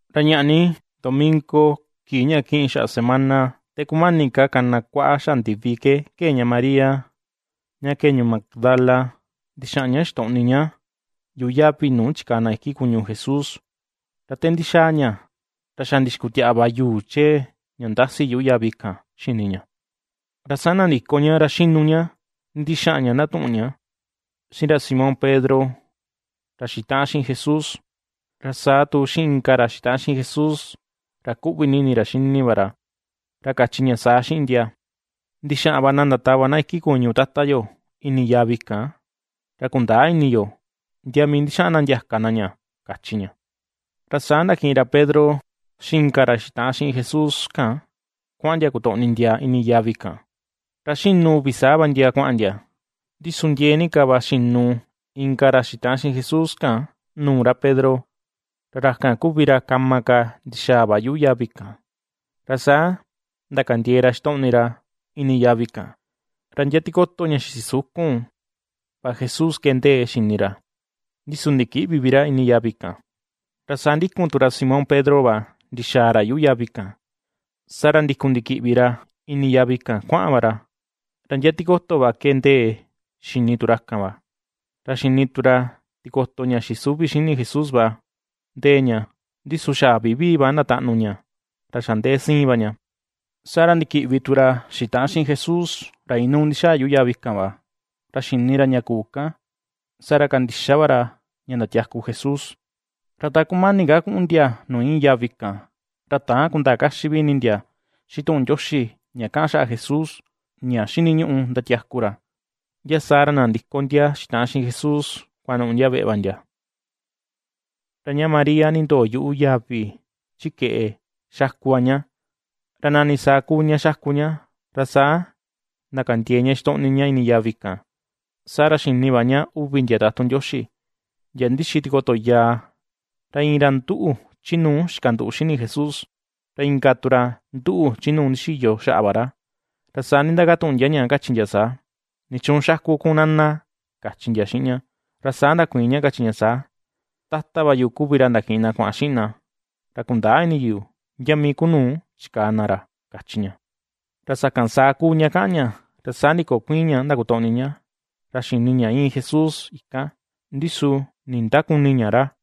Ra ñaꞌa ni domingo, kii ña kiꞌin xaꞌa semana te kumani ka kana kuaꞌa xaꞌa ndivi, ke kee ña María, ña kee ñuu Magdala ndixaꞌan ña xitoꞌni ña, yuꞌu yavi nuu chikaa na iki kuñu Jesús. Ra te ndixaa ña, ra xa ndixikutiaꞌa va yuu chee ña ndasi yuꞌu yavi kan xini ña. Ra saa nandiko ña, ra xinu ña ndixaꞌan ña ndatuꞌun ña xiꞌin ra Simón Pedro ra xitaꞌan xiꞌin Jesús, ra saa tu xiꞌin inka ra xitaꞌan xiꞌin Jesús ra kuꞌvi ni ini ra xini va ra, ra kachi ña saa xiꞌin ndia: ―Ndixaꞌan va na ndatava na iki kuñu Tata yo ini yavi kan, ra kundäa ini yo, ndia mii ndixaꞌan na ndiaka na ña ―kachi ña. Ra saa ndakiꞌin ra Pedro xiꞌin inka ra xitaꞌan xiꞌin Jesús kan kuaꞌan ndia kutoꞌni ndia ini yavi kan. Ra xinu uvi saa va ndia kuaꞌan ndia; ndi su ndiee ni ka va xinu inka ra xitaꞌan xiꞌin Jesús kan, nuu ra Pedro, ra ra kan kuvi ra, kama ka ndixaa va yuꞌu yavi kan. Ra saa ndakandiee ra xitoꞌni ra ini yavi kan, ra ndia tikoto ña xisukun va Jesús ke ndee xini ra, ndi su ndikïꞌvi vi ra ini yavi kan. Ra saa ndikun tu ra Simón Pedro va ndixaa ra yuꞌu yavi kan, saa ra ndikun ndikiꞌvi ra ini yavi kan kuaꞌan va ra, ra ndia tikoto va ke ndee xini tu ra kan va; ra xini tu ra tikoto ña xisuvi xini Jesús va ndee ña, ndi su xa vivii va ndataꞌnu ña, ra xa ndee siin va ña. Saa ra ndikiꞌvi tu ra xitaꞌan xiꞌin Jesús, ra inuu ndixaa yuꞌu yavi kan va, ra xini ra ña kuu kan, saa ra kandixa va ra ña ndatiaku Jesús. Ra ta kumani ka kuꞌun ndia nuu iin yavi kan, ra täan kundaa kaxi vi ini ndia xiꞌin tuꞌun Ndioxi, ña kaꞌan xaꞌa Jesús, ña xiniñuꞌu ndatiaku ra. Ndia saa ra nandiko ndia xitaꞌan xiꞌin Jesús, kuanuꞌu ndia veꞌe va ndia. Ra ña María nindoo yuꞌu yavi chi keꞌe, xaku va ña, ra nani saa kuu ña xaku ña, ra saa ndakandiee ña xitoꞌni ña ini yavi kan. Saa ra xini va ña uvi ndia tatun Ndioxi, ndia ndixi tikoto yaa, ra iin ra nduꞌu chi nuu xikanduꞌu xini Jesús, ra inka tu ra nduꞌu chi nuu ndixiyo xaꞌa va ra. Ra saa nindakatuꞌun ndia ña, kachi ndia saa: ―¿Nichuun xaku kun, Nana? ―kachi ndia xiꞌin ña. Ra saa ndakuiin ña, kachi ña saa: ―Tata va yu kuvi ra ndakiꞌin na kuaꞌan xiꞌin na, ra kundäa ini yu, ndia mii ku nuu chikaa na ra ―kachi ña. Ra sakan saa kuu ña kaꞌan ña, ra saa ndikokuiin ña ndakutoꞌni ña, ra xini ña íin Jesús ikan, ndi su nindäkuni ña ra.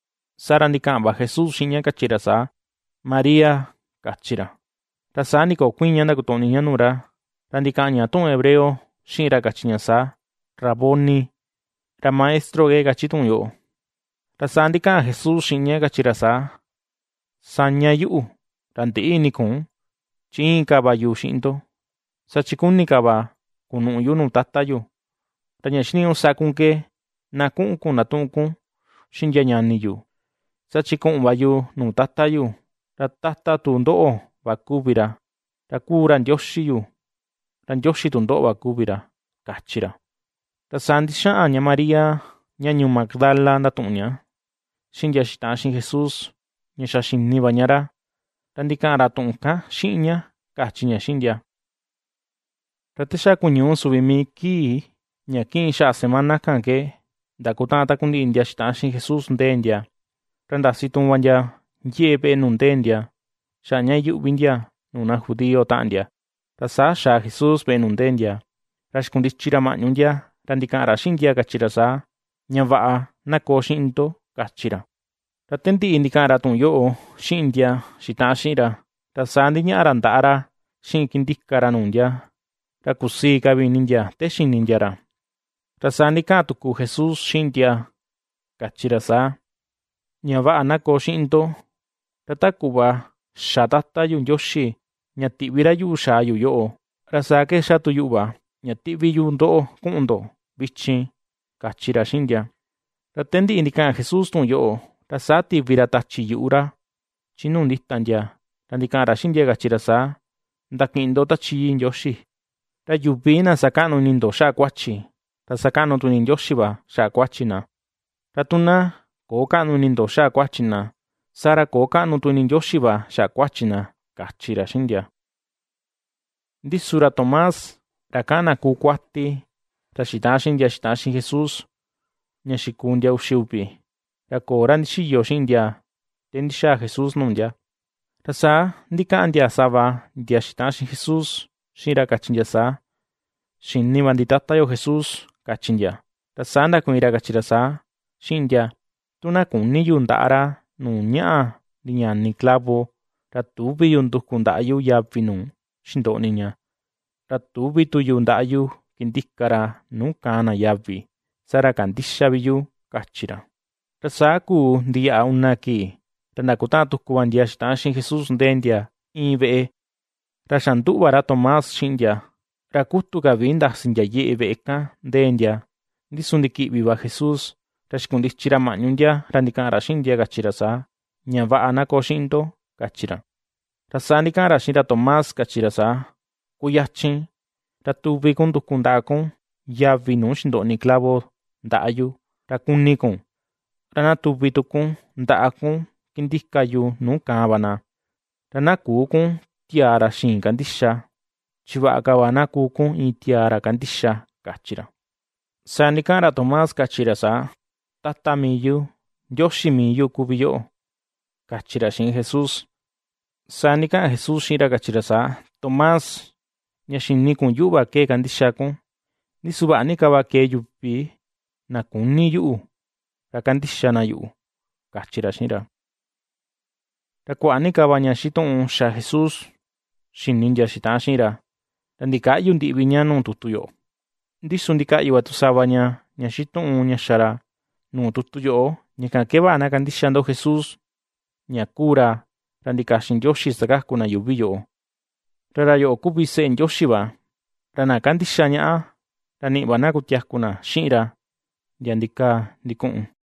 Saa ra ndikaꞌan va Jesús xiꞌin ña, kachi ra saa: ―¡María! ―kachi ra. Ra saa ndikokuiin ña ndakutoꞌni ña nuu ra, ra ndikaꞌan ña tuꞌun hebreo xiꞌin ra, kachi ña saa: ―¡Raboni! ―ra Maestro ke kachi tuꞌun yoꞌo. Ra saa ndikaꞌan Jesús xiꞌin ña kachi ra saa: ―Saña yuꞌu, ra ndïꞌi ini kun chi íin ka va yu xiꞌin ndo, saa chi kuni ka va kunuꞌu yu nu Tata yu. Ra ña xiniñuꞌu sa kun ke, na kuꞌun kun ndatuꞌun kun xiꞌin ndia ñani yu, saa chi kuꞌun va yu nuu Tata yu, ra Tata tu ndoꞌo va kuvi ra, ra kuu ra Ndioxi yu, ra Ndioxi tu ndoꞌo va kuvi ra ―kachi ra. Ra saa ndixaꞌan ña María, ña ñuu Magdala ndatuꞌun ña xiꞌin ndia xitaꞌan xiꞌin Jesús, ña xa xini va ña ra, ra ndikaꞌan ra tuꞌun kan xiꞌin ña, kachi ña xiꞌin ndia. Ra te xa kuñuu suvi mii kii, ña kiꞌin xaꞌa semana kan ke, ndakutaꞌan takundiꞌi ndia xitaꞌan xiꞌin Jesús ndee ndia, ra ndasi tuun va yeꞌe veꞌe nuu ndee ndia, xaꞌa ña iyuꞌvi ndia nuu na judío taꞌan ndia. Ra saa xaa Jesús veꞌe nu ndee ndia, ra xikundichi ra mañu ndia, ra ndikaꞌan ra xiꞌin ndia kachi ra saa: ―Ña vaꞌa, na koo xiꞌin ndo ―kachi ra. Ra te ndiꞌi ndikaꞌan ra tuꞌun yoꞌo xiꞌin ndia xitaꞌan xiꞌin ra, ra saa ndiñaꞌa ra ndaꞌa ra xiꞌin kindika ra nuu ndia. Ra kusii ka vi ini ndia, te xini ndia ra. Ra saa ndikaꞌan tuku Jesús xiꞌin ndia, kachi ra saa: ―Ña vaꞌa na koo xiꞌin ndo. Ra ta kuꞌva xa Tata yu Ndioxi ña tiꞌvi ra yuꞌu xaa yu yoꞌo, ra saa ke ^xa tu yuꞌu va, ña tiꞌvi yu ndoꞌo kuꞌun ndo vichin ―kachi ra xiꞌin ndia. Ra te ndiꞌi ndikaꞌan Jesús tuꞌun yoꞌo, ra saa tivi ra tachi yuꞌu ra, chi nuu ndita ndia ra ndikaꞌan ra xiꞌin ndia, kachi ra saa: ―Ndakiꞌin ndo Tachi Yii Ndioxi. Ra yuvi na sakaꞌnu ini ndo xaꞌa kuachi, ra sakaꞌnu tu ini Ndioxi va xaꞌa kuachi na; ra tu na köo kaꞌnu ini ndo xaꞌa kuachi na, saa ra köo kaꞌnu tu ini Ndioxi va xaꞌa kuachi na ―kachi ra xiꞌin ndia. Ndi su ra Tomás, ra kaꞌan na kuu kuati, ra xitaꞌan xiꞌin ndia xitaꞌan xiꞌin Jesús, ña xikuu ndia uxi uvi, ra köo ra ndixiyo xiꞌin ndia te ndixaa Jesús nuu ndia. Ra saa ndikaꞌan ndia sava, ndia xitaꞌan xiꞌin Jesús xiꞌin ra, kachi ndia saa: ―Xini va ndi, tata yo Jesús ―kachi ndia. Ra saa ndakuiin ra kachi ra saa, xiꞌin ndia: ―Tu na küni yu, ndaꞌa ra nuu ñaꞌa ndiñani clavo, ra tüvi yu, nduku ndaꞌa yu yavi nuu xindoꞌni ña, ra tüvi tu yu ndaꞌa yu, kindika ra nuu kaan na yavi, saa ra kandïxa vi yu ―kachi ra. Ra saa kuu ndiyaꞌa una kii, ra ndakutaꞌan tuku va ndia xitaꞌan xiꞌin Jesús ndee ndia iin veꞌe, ra xa nduꞌu va ra Tomás xiꞌin ndia. Ra kutu ka vi ndasi yeꞌe veꞌe kan ndee ndia, ndi su ndikiꞌvi va Jesús, ra xikundichi ra maꞌñu ndia, ra ndikaꞌan ra xiꞌin ndia, kachi ra saa: ―Ña vaꞌa, na koo xiꞌin ndo ―kachi ra. Ra saa ndikaꞌan ra xiꞌin ra Tomás, kachi ra saa: ―Kuyachin, ra tuvi kun nduku ndaꞌa kun, yavi nu xindoꞌni clavo ndaꞌa yu, ra kuni kun, ra na tuvi tu kun, ndaꞌa kun kindika yu nuu kaan va na; ra na küu kun tiaa ra xïin kandixa, chi vaꞌa ka va na kuu kun iin tiaa ra kandixa ―kachi ra. Saa ndikaꞌan ra Tomás, kachi ra saa: ―¡Tata mii yu, Ndioxi mii yu kuvi yoꞌo! ―kachi ra xiꞌin Jesús. Saa ndikaꞌan Jesús xiꞌin ra, kachi ra saa: ―Tomás, ña xini kun yuꞌu va ke ^kandixa kun. Ndi su vaꞌa ni ka va kee yuvi na küni yuꞌu, ra kandixa na yuꞌu ―kachi ra xiꞌin ra. Ra kuaꞌa ni ka va ña xituꞌun xa Jesús, xini ndia xitaꞌan xiꞌin ra, ra ndikäꞌyu ndiꞌi vi ña nuu tutu yoꞌo. Ndi su ndikaꞌyu va tu sava ña xituꞌun ña xa ra, nuu tutu yoꞌo, ña kan ke vaꞌa na kandixa ndo Jesús, ña kuu ra, ra ndikaxin Ndioxi sakaku na yuuvi yoꞌo, ra ra yoꞌo kuvi seꞌe Ndioxi va, ra na ^kandixa ñaꞌa, ra niꞌi va na ña kutiaku xiꞌin ra, ndia ndikaa ndikuꞌun.